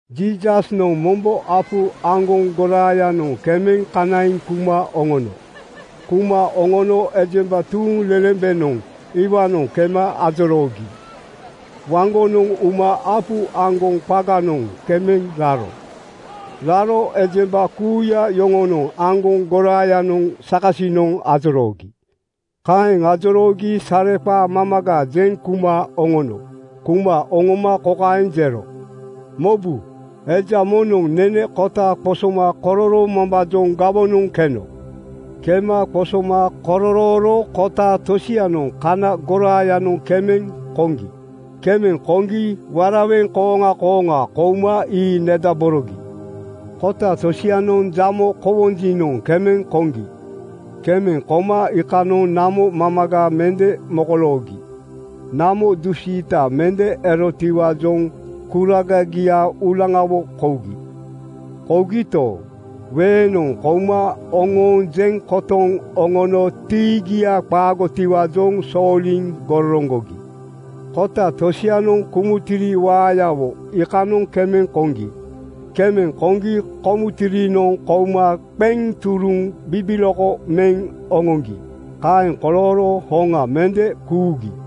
Jiisasnoŋ mombo apu aŋgoŋ goraayanoŋ kemeŋ kanaiŋ kuma oŋono. Kuma oŋono ejemba tuuŋlelembenoŋ iwaanoŋ kema ajoroogi waŋgonoŋ uma apu aŋgoŋ qaganoŋ kema raro. Raro ejemba kuuya yoŋonoŋ aŋgoŋ goraayanoŋ sakasinoŋ ajoroogi. Kaeŋ ajoroogi sareqaa mamaga jeŋ kuma oŋono. Kuma oŋoma kokaeŋ jero: “Mobu! Eja moŋnoŋ nene kota qosoma kororoomambaajoŋ gawonoŋ keno. Kema qosoma kororooro kota tosianoŋ kana goraayanoŋ kemeŋ koŋgi. Kemeŋ koŋgi (waraweŋ) kooŋa kooŋa kouma ii nedaborogi. Kota tosianoŋ jamo kowonjinoŋ kemeŋ koŋgi. Kemeŋ koma iikanoŋ namo mamaga mende mokoloogi. Namo dusiita mende erotiwaajoŋ kuragagia uulaŋawo kougi. Kougito, weeŋnoŋ kouma oŋooŋ jeŋ kotoŋ oŋono tiigia qaagotiwaajoŋ sooliŋ gororoŋgogi. Kota tosianoŋ kumuntiri waayawo iikanoŋ kemeŋ koŋgi. Kemeŋ koŋgi komuntirinoŋ kouma qeŋ turuŋ bibiloko meŋ oŋoŋgi. Kaeŋ kolooro hoŋa mende kuugi.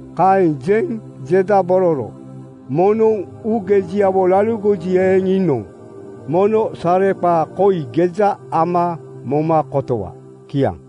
Kaeŋ jeŋ jedabororo, “Moŋnoŋ uugejiawo laligoji eeŋ, iinoŋ mono sareqaa koi geja ama moma kotowa.” Kiaŋ.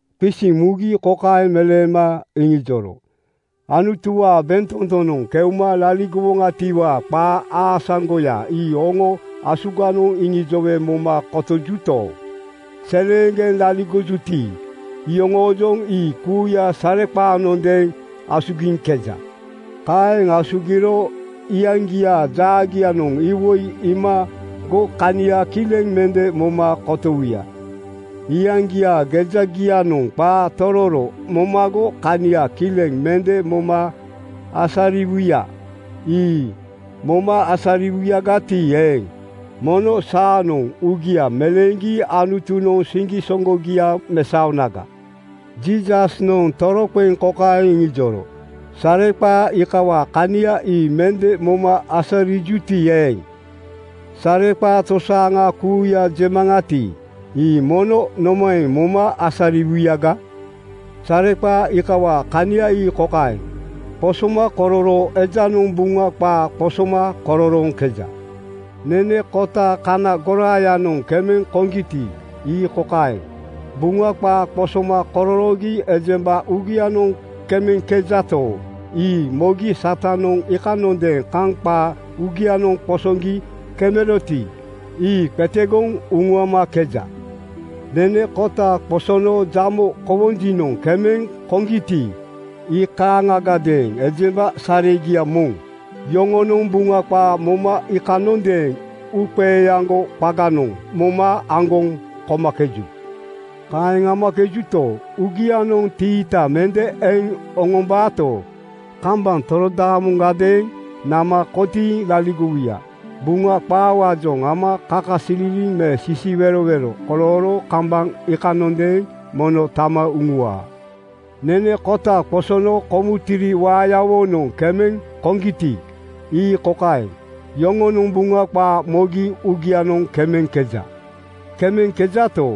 Qisiŋ mugi kokaeŋ meleema iŋijoro, “Anutuwaa bentotonoŋ keuma laligowoŋatiwaa qaa aasaŋgoya ii oŋo asuganoŋ iŋijowe moma kotojuto, seleeŋgeŋ laligojuti, iyoŋoojoŋ ii kuuya sareqaanondeeŋ asugiŋkeja. Kaeŋ asugiro ‘Iyaŋgiaa jaagianoŋ iwoi iimago kania kileŋ mende moma kotowuya. Iyaŋgiaa gejagianoŋ qaa tororo momago kania kileŋ mende moma asariwuya. Ii moma asariwuyagati eeŋ, mono saanoŋ uugia meleeŋgi Anutunoŋ siŋgisoŋgogia mesaonaga.’” Jiisasnoŋ toroqeŋ kokaeŋ iŋijoro, “Sareqaa iikawaa kania ii mende moma asarijuti eeŋ, sareqaa tosaaŋa kuuya jemaŋati, ii mono nomaeŋ moma asariwuyaga? Sareqaa iikawaa kania ii kokaeŋ: Qosomakororoo ejanoŋ Buŋa qaa qosoma kororooŋkeja. Nene kota kana goraayanoŋ kemeŋ koŋgiti, ii kokaeŋ: Buŋa qaa qosoma kororoogi ejemba uugianoŋ kemeŋkejato, ii mogi Satanoŋ iikanondeeŋ kaŋ qaa uugianoŋ qosoŋgi kemeroti, ii qetegoŋ uŋuamakeja. Nene kota qosono jamo kowonjinoŋ kemeŋ koŋgiti, ii kaaŋagadeeŋ ejemba saregia moŋ. Yoŋonoŋ Buŋa qaa moma iikanondeeŋ uuqeeaŋgo qaganoŋ moma aŋgoŋ komakeju. Kaeŋ amakejuto, uugianoŋ tiita mende eŋ oŋombaato, kambaŋ torodaamoŋadeeŋ nama kotiiŋ laligowuya. Buŋa qaawaajoŋ ama kakasililiŋ me sisiwerowero kolooro kambaŋ iikanondeeŋ mono tama uŋuwaa. Nene kota qosono kumuntiri waayawonoŋ kemeŋ koŋgiti, ii kokaeŋ: Yoŋonoŋ Buŋa qaa mogi uugianoŋ kemeŋkeja. Kemeŋkejato,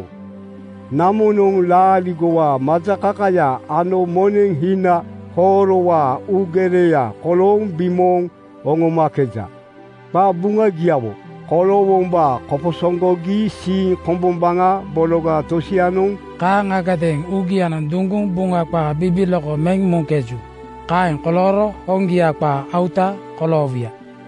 namonoŋ laaligowaa majakakaya ano moneŋ hina hoorowaa uugereya kolooŋ bimooŋ oŋomakeja. Qabuŋagiawo koloowombaa koposoŋgogi siiŋ kombombaŋa bologa tosianoŋ kaaŋagadeeŋ uugianoŋ duŋguŋ Buŋa qaa bibiloko meŋ muŋkeju. Kaeŋ kolooro hoŋgia qaa auta (gipeya) koloowuya.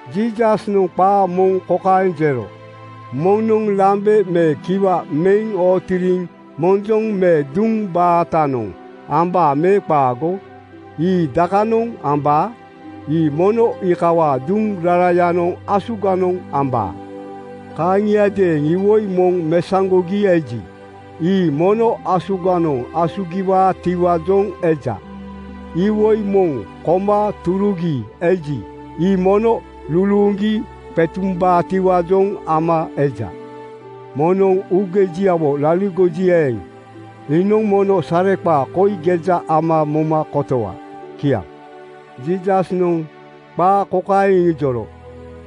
Jiisasnoŋ qaa moŋ kokaeŋ jero, “Moŋnoŋ lambe me kiwa meŋ ootiriŋ monjoŋ me duŋ baatanoŋ ambaa me qaago? Ii dakanoŋ ambaa? Ii mono iikawaa duŋ rarayanoŋ asuganoŋ ambaa. Kaaŋiadeeŋ iwoi moŋ mesaŋgogi eji, ii mono asuganoŋ asugiwaatiwaajoŋ eja. Iwoi moŋ koma turugi eji, ii mono luluuŋgi qetumbaatiwaajoŋ ama eja. Moŋnoŋ uugejiawo laligoji eeŋ, iinoŋ mono sareqaa koi geja ama moma kotowa.” Kiaŋ. Jiisasnoŋ qaa kokaeŋ iŋijoro,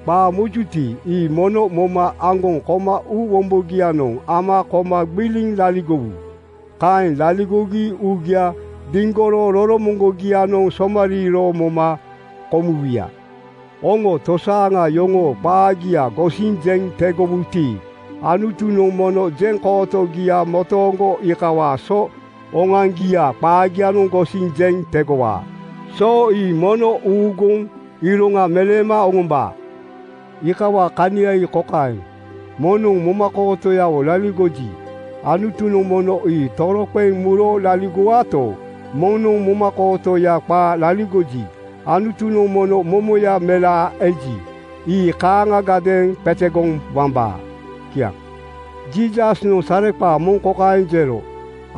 “Qaa mojuti, ii mono moma aŋgoŋ koma uu wombogianoŋ ama koma gbiliŋ laligowu. (Kaeŋ laligogi uugia diŋgoro roromoŋgogianoŋ somariiro moma komuwuya.) Oŋo tosaaŋa yoŋoo qaagia gosiŋ jeŋ tegowuti, Anutunoŋ mono jeŋkootogia motooŋgo iikawaa so oŋoaŋgiaa qaagia gosiŋ jeŋ tegowaa. So ii mono uuguŋ iroŋa meleema oŋombaa. Iikawaa kania ii kokaeŋ: Moŋnoŋ momakootoyawo laligoji, Anutunoŋ mono ii toroqeŋ muro laligowaato, moŋnoŋ momakootoya qaa laligoji, Anutunoŋ mono momoya melaa eji, ii kaaŋagadeeŋ qetegoŋ wambaa.” Kiaŋ. Jiisasnoŋ sareqaa moŋ kokaeŋ jero,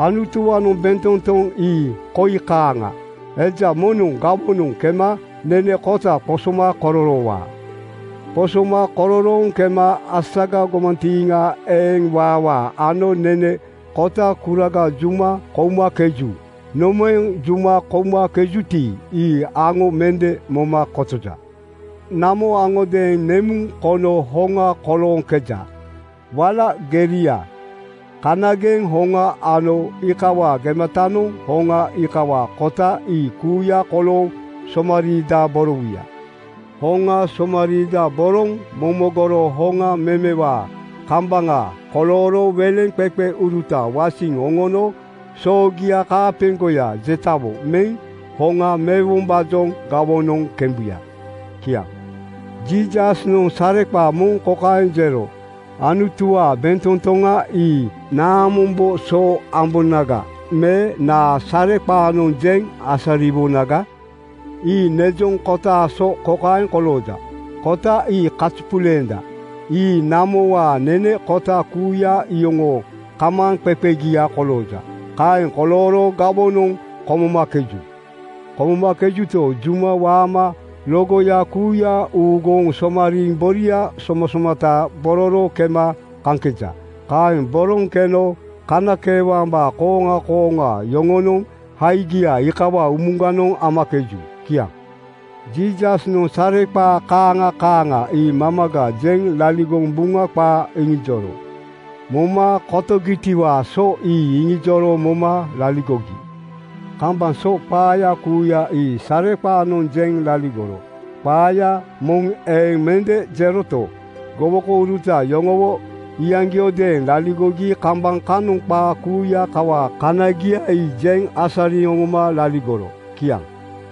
“Anutuwaanoŋ bentotoŋ ii koi kaaŋa: Eja moŋnoŋ gawonoŋ kema nene kota qosoma kororoowaa. Qosoma kororooŋ kema asaga gomantiiŋa eŋ waawaa ano nene kotaa kuraga juma koumakeju. Nomaeŋ juma koumakejuti, ii aŋo mende moma kotoja. Namo aŋodeeŋ nemuŋ kono hoŋa kolooŋkeja: Wala geria, kanageŋ hoŋa ano iikawaa gematanoŋ hoŋa iikawaa kota ii kuuya kolooŋ somariidaborowuya. Hoŋa somariidaboroŋ momogoro hoŋa memewaa kambaŋa kolooro weleŋqeqeuruta wasiŋ oŋono soogia kaapeŋgoya jetawo meŋ hoŋa mewombaajoŋ gawoŋanoŋ kembuya.” Kiaŋ. Jiisasnoŋ sareqaa moŋ kokaeŋ jero, “Anutuwaa bentotoŋa ii naamombo so ambonaga me naa sareqaanoŋ jeŋ asariwonaga? Ii nejoŋ kotaa so kokaeŋ kolooja: Kota ii kazupuleenda. Ii namowaa nene kota kuuya iyoŋoo kamaaŋqeqegia kolooja. Kaeŋ kolooro gawonoŋ komomakeju. Komomakejuto, juma waama logoya kuuya uŋuuguŋ somariiŋ boria somasomata bororo kema kaŋkeja. Kaeŋ boroŋ keno kanakeewambaa kooŋa kooŋa yoŋonoŋ haigia iikawaa umuganoŋ amakeju.” Kiaŋ. Jiisasnoŋ sareqaa kaaŋa kaaŋa ii mamaga jeŋ laligoŋ Buŋa qaa iŋijoro. Moma kotogitiwaa so ii iŋijoro moma laligogi. Kambaŋ so qaaya kuuya ii sareqaanoŋ jeŋ laligoro. Qaaya moŋ eeŋ mende jeroto, gowokouruta yoŋowo iyaŋgiodeeŋ laligogi kambaŋ kanoŋ qaa kuuya kawaa kanagia ii jeŋ asariŋ oŋoma laligoro. Kiaŋ.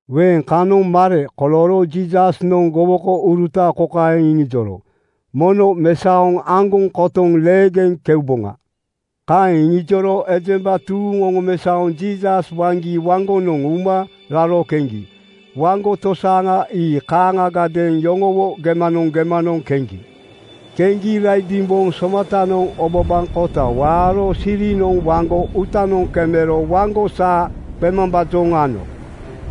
Weeŋ kanoŋ mare kolooro Jiisasnoŋ gowokouruta kokaeŋ iŋijoro, “Mono mesaoŋ aŋgoŋ kotoŋ leegeŋ keuboŋa.” Kaeŋ iŋijoro ejemba tuuŋ oŋomesaoŋ Jiisas waŋgi waŋgonoŋ uma raro keŋgi. Waŋgo tosaaŋa ii kaaŋagadeeŋ yoŋowo gemanoŋ gemanoŋ keŋgi. Keŋgi raidimboŋ somatanoŋ obabaŋkota waaro sirinoŋ waŋgo uutanoŋ kemero waŋgo saa qemambaajoŋ ano.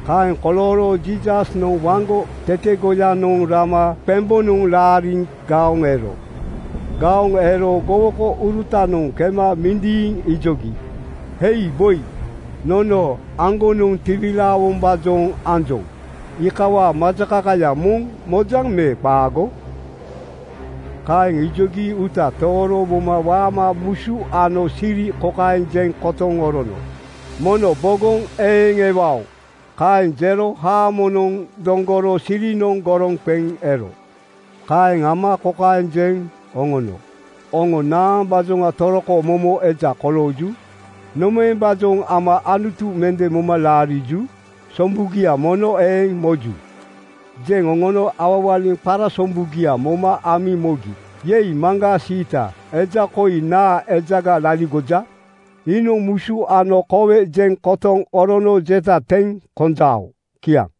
Kaeŋ kolooro Jiisasnoŋ waŋgo tetegoyanoŋ rama qembonoŋ laariŋ gaoŋ ero. Gaoŋ ero gowokourutanoŋ kema mindiiŋ ijogi, “Hei boi! Nono aŋgonoŋ tiwilaawombaajoŋ anjoŋ. Iikawaa majakakaya moŋ mojaŋ me qaago?” Kaeŋ ijogi uuta tooro moma waama musu ano siri kokaeŋ jeŋ kotoŋ orono, “Mono bogoŋ eeŋ ewao!” Kaeŋ jero haamonoŋ doŋgoro sirinoŋ goroŋ qeŋ ero. Kaeŋ ama kokaeŋ jeŋ oŋono, “Oŋo naambaajoŋa toroko momo eja kolooju? Nomaembaajoŋ ama Anutu mende moma laariju? Sombugia mono eeŋ moju.” Jeŋ oŋono awawaliŋ qarasombugia moma amiŋ mogi, “Yei, maŋgaa siita! Eja koi naa ejaga laligoja? Iinoŋ musu ano kowe jeŋ kotoŋ orono jeta teŋ konjao?” Kiaŋ.